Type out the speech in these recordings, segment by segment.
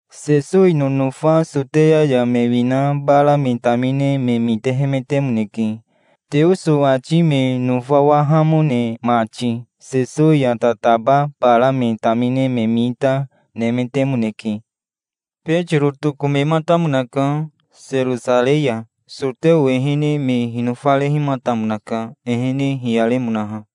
Sesowi nonofa Soteya ya me wina bara me tamine me mitehemetemoneke, Teoso ati me nofawahamone mati. Sesowi ya tataba bara me tamine me mita, nemetemoneke. Betiro tokomematamonaka Serosarei ya. Soteo ehene me hinofarehimatamonaka, ehene hiyaremonaha.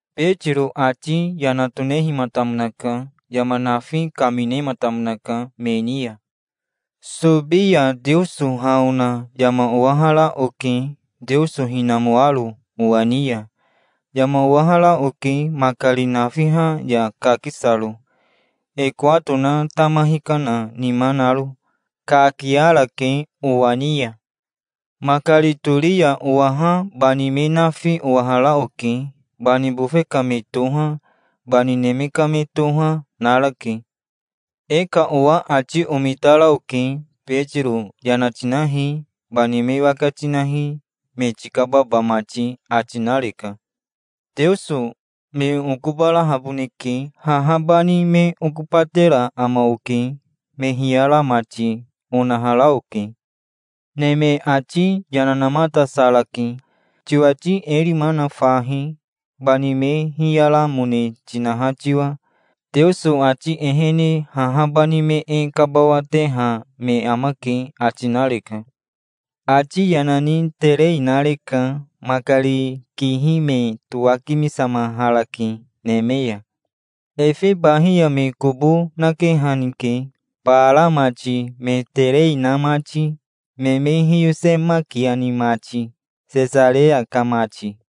Betiro ati yana tonehimatamonaka. Yama nafi kaminematamonaka me ni ya. "Sobi ya Teoso ha ona yama owahara oke, Teoso hinamoaro owa ni ya. Yama owahara oke makari nafiha ya kakisaro, e kowato na tama hikana nima naro. Kakiarake owa ni ya. Makari tori owaha bani me nafi owahara oke. Bani bofe ka me toha, bani neme ka me toha, narake. E ka owa ati omitara oke. 'Betiro yana tinahi. Bani me waka tinahi, me tikababa mati', ati nareka. 'Teoso me okobarahaboneke. Haha bani me okobatera ama oke, me hiyara mati', onahara oke. Neme ati yana namatasarake. 'Tiwati e rima na fahi, bani me hiyaramone tinaha tiwa. Teoso ati ehene haha bani me e kabawateha me amake', ati nareka. Ati yana ni terei nareka. Makari kihi me towakimisamaharake neme ya. Efe bahi ya me kobo nakehanike, bara mati, me terei na mati, me me hiyosemakiani mati, Sesareya ka mati.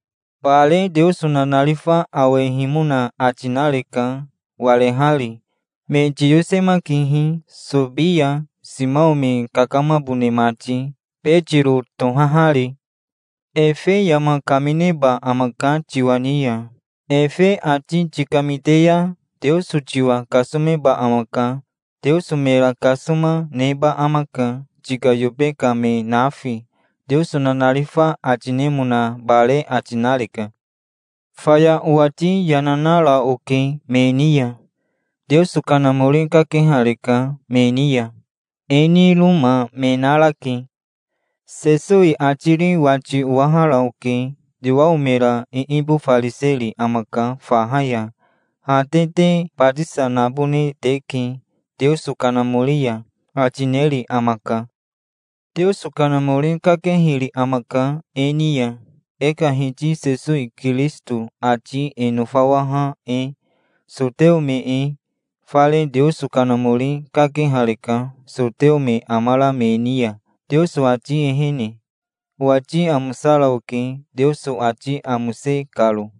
Bare Teoso nanarifa awehimona ati nareka, warehari. 'Me tiyosemakihi Sobi ya, Simao me kakamabone mati, Betiro tohahari. Efe yama kamineba amaka tiwa ni ya. Efe ati tikamite ya Teoso tiwa kasomeba amaka. Teoso mera kasoma, neba amaka, tika yobe ka me nafi', Teoso nanarifa ati nemona bare ati nareka". "Faya owati yana nara oke me ni ya. Teoso Kanamori kakehareka me ni ya. E niroma me narake. Sesowi atiri wati owahara oke. 'Yowao mera iibofariseri amaka faha ya. Ha te te batisa nabone teke Teoso Kanamori ya', ati neri amaka. Teoso Kanamori kakehiri amaka e ni ya, e ka Hiti Sesowi Kirisito ati e nofawaha e, soteo me e. Fare Teoso Kanamori kakehareka soteo me amara me ni ya, Teoso ati ehene. Owati amosara oke, Teoso ati amose karo".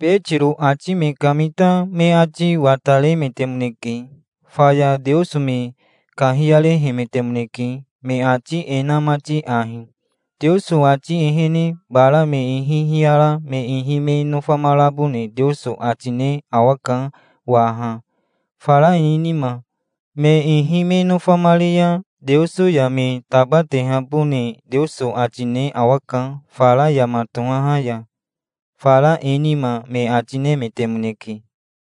Betiro ati me kamita me ati wataremetemoneke. Faya Teoso me kahiyarehemetemoneke, me ati e na mati ahi: "Teoso ati ehene bara me ihi hiyara me ihi me nofamarabone Teoso ati ne awaka waha, fara e nima. Me ihi me nofamari ya Teoso ya me tabatehabone Teoso ati ne awaka fara yama tohaha ya, fara e nima", me ati nemetemoneke.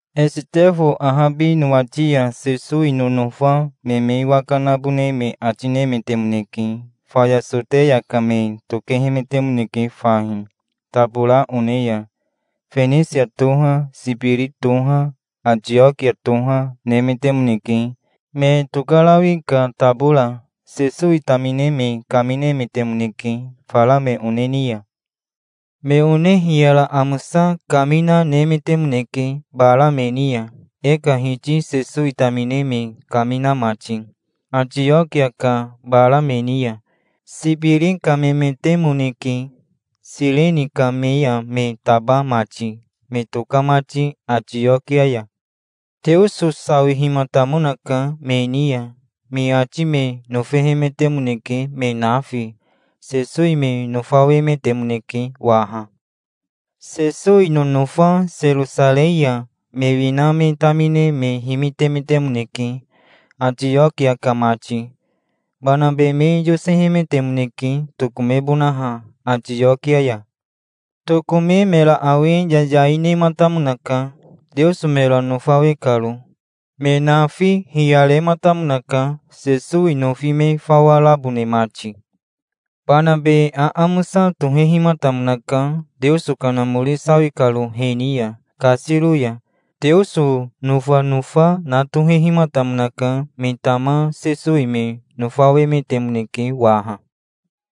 Esitefo ahabi nowati ya Sesowi nonofa me me waka nabone me ati nemetemoneke. Faya Soteya ka me tokehemetemoneke fahi, tabora one ya. Fenisia toha, Sibiri toha, Atiokia toha, nemetemoneke, me tokarawi ka tabora. Sesowi tamine me kaminemetemoneke, fara me one ni ya. Me one hiyara amosa kamina nemetemoneke bara me ni ya, e ka Hiti Sesowi tamine me kamina mati, Atiokia ka bara me ni ya. Sibiri ka memetemoneke, Sireni ka me ya me taba mati, me toka mati Atiokia ya. Teoso sawihimatamonaka me ni ya. Me ati me nofehemetemoneke, me nafi. Sesowi me nofawemetemoneke waha. Sesowi nonofa Serosarei ya me wina me tamine me himitemetemoneke, Atiokia ka mati. Banabe me yosehemetemoneke, tokomebonaha Atiokia ya. Tokome mera awe yayai nematamonaka, Teoso mera nofawe karo. Me nafi hiyarematamonaka, Sesowi nofi me fawa rabone mati. Banabe aamosa tohehimatamonaka, Teoso Kanamori sawi karo he ni ya, kasiro ya. Teoso nofanofa, na tohehimatamonaka. Me tama Sesowi me nofawemetemoneke waha.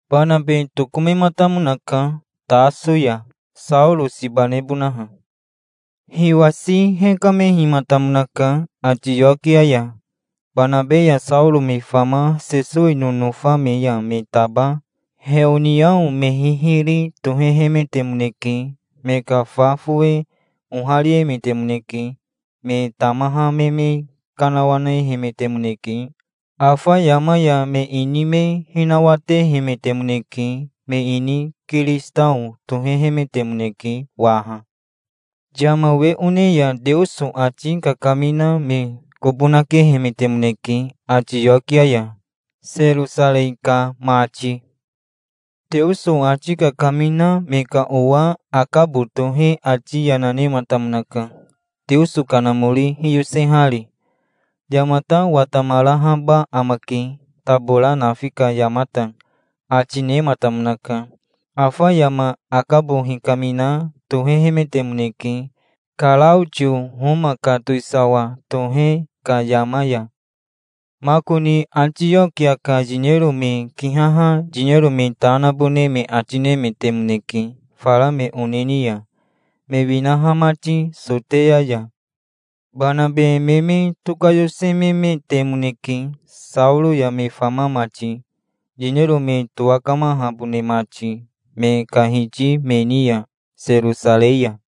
Banabe tokomematamonaka Taso ya, Saoro siba nebonaha. Hiwasi hekamehimatamonaka Atiokia ya. Banabe ya Saoro me fama Sesowi nonofa me ya me taba heoniao me hihiri tohehemetemoneke. Me ka fa fowe ohariemetemoneke. Me tamaha me me kanawanehemetemoneke. Afa yama ya me ini me hinawatehemetemoneke. Me ini kiristao tohehemetemoneke waha. Yama we one ya Teoso ati kakamina me kobo nakehemetemoneke Atiokia ya, Serosarei ka mati. Teoso ati kakamina me ka owa Akabo tohe ati yana nematamonaka, Teoso Kanamori hiyosehari. "Yamata watamarahaba amake, tabora nafi ka yamata", ati nematamonaka. Afa yama Akabo hikamina tohehemetemoneke, Karaotio Homa ka towisawa tohe ka yama ya. Makoni Atiokia ka yinero me kihaha yinero me ta nabone me ati nemetemoneke fara me one ni ya, me winaha mati Soteya ya. Banabe me me tokayosememetemoneke, Saoro ya me fama mati, yinero me towakamahabone mati me ka hiti me ni ya, Serosarei ya.